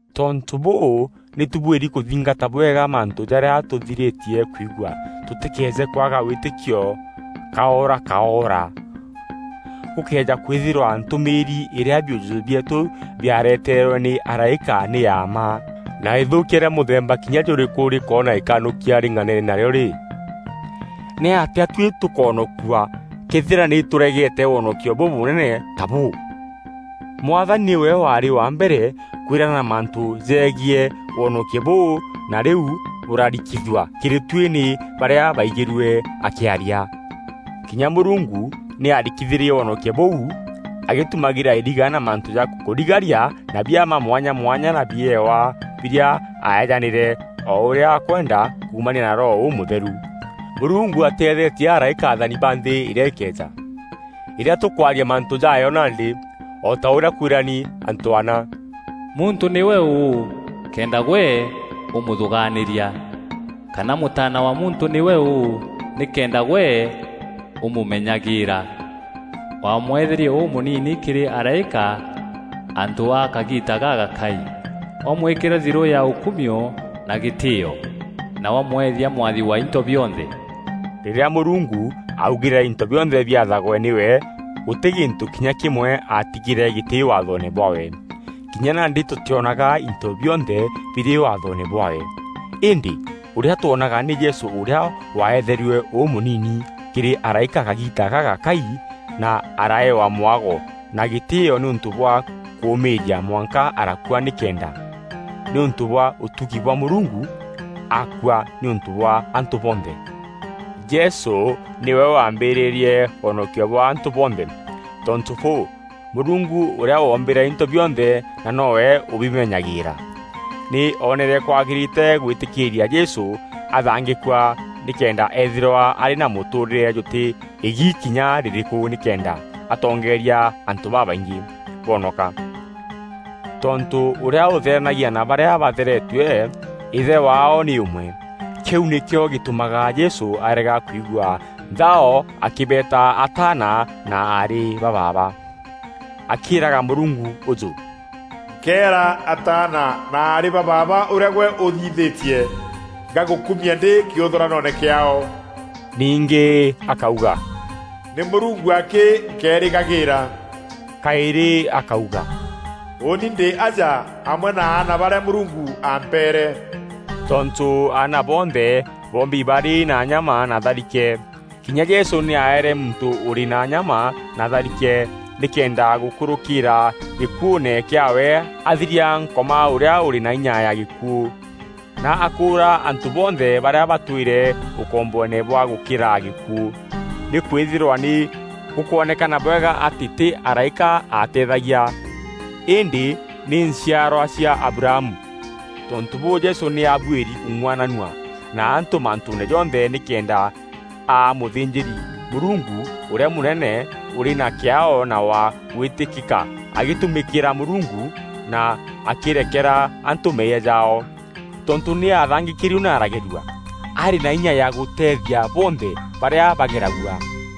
Tontû bûû, nî tûbuîri kûthingata bwega mantû jarîa tûthirîtie kwigua tûtîkeeje kwaga wîtîkio kaorakaora. Gûkëeja kwîthîrwa ntûmîîri îrîa biûjûjû bieetû biareteerwe nî araîka nî ya mma, na îthûûkia rîa mûthemba kinya jûrîkû rîkoona îkanûkia rîng'anene narîo rî, nîatîa tuî tûkoonokua këethîra nî tûregeete wonokio bûbûnene ta bûû? Mwathani nîwe waarî wa mbere kwîrana mantû jegiî wonokio bûu na rîu bûrarikithua kîrî tuî nî barîa baaigîrue akîaria. Kinya Mûrungu nî aarikithîrie wonokio bûu agîtumagîra iriga na mantû ja kûrigaria na biama mwanya mwanya na biewa birîa aaeejanîre o ûrîa akwenda kuumania na Roho Ûmûtheru. Mûrungu atîethetie araîka athani ba nthî îrîa îkeeja; îrîa tûkwaria mantû jaayo nandî. O ta ûrîa kwîrani antû ana: “Muntû nîwe ûû kenda gwe ûmûthûgaanîria? Kana mûtaana wa muntû nîwe ûû nîkenda gwe ûmûmenyagîîra? Wamweetherie ûmûnini kîrî araîka antû a kagiita gagakai, wamwîkîra thirû ya ûkumio na gîtîîo, na wamweethia mwathi wa into bionthe.” Rîrîa Mûrungu aaugîre into bionthe biathagwe nîwe, gûtî gîntû kinya kîmwe aatigîre gîtî waathoone bwaawe. Kinya nandî tûtîonaga into bionthe birî waathoone bwaawe. Îndî ûrîa twonaga nî Jesû ûrîa waeetherue ûmûnini kîrî araîka kagiita gagakai na araeewa mwago na gîtîîo nîûntû bwa kûûmîîria mwanka arakua nîkenda, nîûntû bwa ûtugi bwa Mûrungu, akua nîûntû bwa antû bonthe. Jesû nîwe waambîrîrie wonokio bwa antû bonthe. Tontû bûû, Mûrungu ûrîa woombîre into bionthe na noo we ûbimenyagîîra, nî oonere kwagîrîte gwîtîkîîria Jesû athangîkua nîkenda eethîrwa arî na mûtûûrîre jûtî îgi kinya rîrîkû nîkenda atongeeria antû babaingî bonoka. Tontû ûrîa ûtheranagia na barîa batheretue Îthe waao nî ûmwe. Kîu nîkîo gîtûmaga Jesû arega kwigua nthao akîbeeta ataana na aarî ba baaba, akîîraga Mûrungu ûjû, “Nkeera ataana na aarî ba baaba ûrîa gwe ûthithîtie; ngagûkumia ndî kîûthûranoone kîaao.” Ningî akauga, “Nî Mûrungu akî nkeerîgagîîra.” Kaîrî akauga, “Ûûni ndî aja, amwe na aana barîa Mûrungu aampeere.” Tontû aana bonthe boombi barî na nyama na tharike, kinya Jesû nî aaere muntû ûrî na nyama na tharike nîkenda gûkûrûkîîra gîkuûne kîaawe athiria Nkoma ûrîa ûrî na inya ya gîkuû, na akûûra antû bonthe barîa batwîre ûkomboone bwa gûkîra gîkuû. Nîkwîthîrwa nî gûkwonekana bwega atî tî araîka ateethagia îndî nî nchiarwa cia Abrahamu. Tontû bûû, Jesû nî aabuîri kûng'uananua na antû mantûûne jonthe nîkenda aa mûthînjîri-Mûrungu ûrîa mûnene ûrî na kîaao na wa gwîtîkîka agîtumîkîra Mûrungu na akîrekera antû meeyia jaao. Tontû nî aathangîkîrue na aragerua, arî na inya ya gûteethia bonthe barîa bageragua.